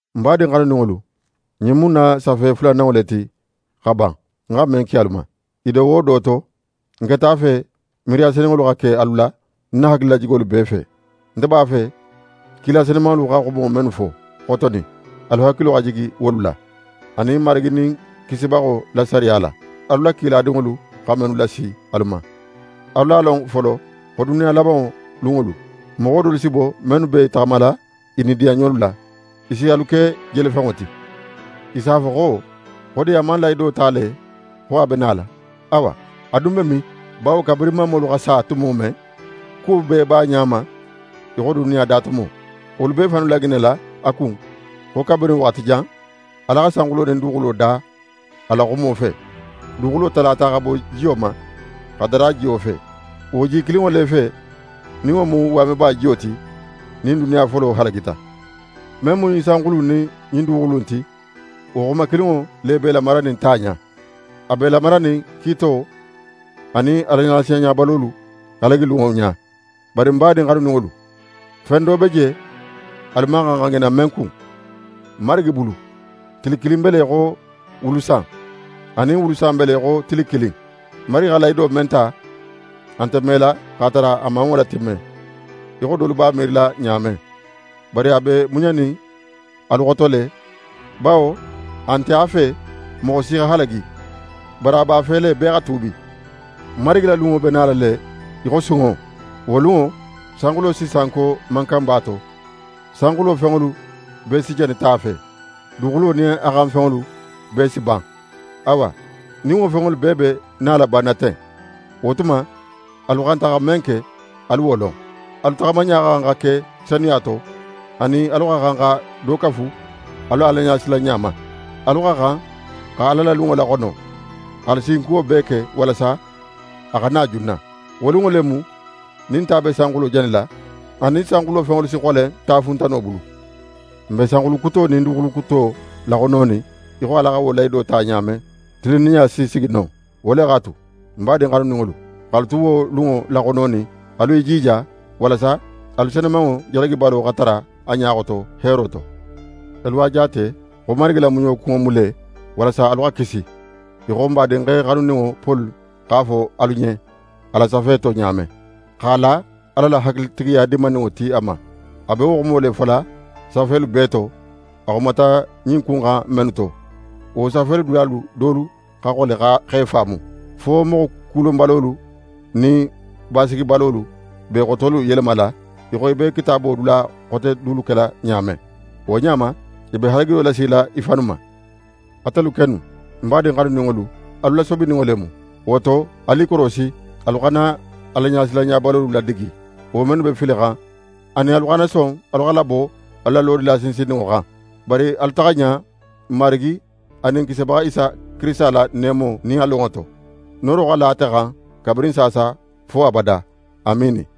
Ń badin xanuninŋolu, ɲin mu ń na safe fulananŋo le ti xa ban, ń xa men ki alu ma. I do wo do to, ń keta a fe miiriya senunŋolu xa ke alu la, ń na hakililajigolu bee fe. Nte b'a fe kila senumanŋolu xa xumo mennu fo xotonin, alu hakilo xa jigi wolu la, anin Marigi nin Kisibaxo la sariya la, alu la kiladinŋolu xa mennu lasi alu ma. Alu a lon folo xo duniya labanŋo lunŋolu, moxo dolu si bo mennu be i taxamala i nidiyanɲolu la. I si alu ke jelefenŋo ti. I s'a fo xo: «Xo di a man lahido ta le xo a be nala? Awa, a dun be min? Bawo kabirin mamolu sa tumo, kuwo bee b'a ɲa ma í xo duniya damuto.» Wolu be i fannu laŋinala a kun xo kabirin waxati jan, Ala xa sanxulo nin duguxulo da a la xumo fe. Duguxulo talata xa bo jiyo ma, xa dara jiyo fe. Wo ji kilinŋo le fe, nin wo mu waameba jiyo ti, nin duniya folo halagita. Men mu ɲin sanxulu in nin ɲin duguxulu in ti, wo xuma kilinŋo le b'e lamaranin ta ɲa. A b'e lamaranin kiito anin Alaɲasilanɲabalolu halagi lunŋo ɲa. Bari ń badin xanuninŋolu, fen do be je, alu man xan xa ŋina men kun: Marigi bulu, tili kilin be le í xo wulu san, anin wulu san be le í xo tili kilin. Marigi xa lahido men ta, a nte mela x'a tara a man wo latimme, í xo dolu b'a miirila ɲa men. Bari a be muɲanin alu xoto le, bawo a nte a fe moxo si xa halagi; bari a b'a fe le bee xa tuubi. Marigi la lunŋo be nala le í xo sunŋo. Wo lunŋo, sanxulo si sanko mankanba to. Sanxulo fenŋolu bee si jani ta fe, duguxulo nin a xan fenŋolu bee si ban. Awa, nin wo fenŋolu bee be nala banna ten, wo tuma alu xanta xa men ke, alu wo lon. Alu taxamaɲa xa xan xa ke senuya to, anin alu xa xan xa do kafu alu la Alaɲasilanɲa ma. Alu xa xan xa Ala la lunŋo laxono, x'alu sinkuwo bee ke walasa a xa na junna. Wo lunŋo le mu nin ta be sanxulo janila, anin sanxulo fenŋolu si xolen tafuntano bulu. N be sanxulu kuto nin duguxulu kuto laxononin í xo Ala xa wo lahido ta ɲa men, tilinninɲa si sigi non. Wo le x'a tu, ń badin xanuninŋolu, x'alu tu wo lunŋo laxononin, alu i jija, walasa alu senumanŋo jalagibalo xa tara a ɲa xoto, heero to. Alu a jaate xo Marigi la muɲo kunŋo mu le walasa alu xa kisi, í xo n badinxe xanuninŋo Poli x'a fo alu ɲen, a la safe to ɲa men, x'a la Ala la hakilitigiya dininŋo ti a ma. A be wo xumo le fola safelu bee to, a xumata ɲin ku in xan mennu to. Wo safelu dulalu dolu xa xole x'e faamu, fo moxo kulonbalolu nin basigibalolu b'e xotolu yelemala, í xo i be Kitaabo dula xote dulu kela ɲa men. Wo ɲa ma, i be halagilo lasila i fannu ma. Atelu kennu, ń badin xanuninŋolu, alu lasobininŋo le mu. Wo to alu i korosi, alu xana Alaɲasilanɲabalolu ladigi, wo mennu be filixan, anin alu xana son alu xa labo alu lodula sinsinninŋo xan. Bari alu taxa ɲa n Marigi anin n Kisibaxa Isa Kirisita la neemo nin a lonŋo to. Nooro xa la ate xan kabirin saasa fo abada. Amiini.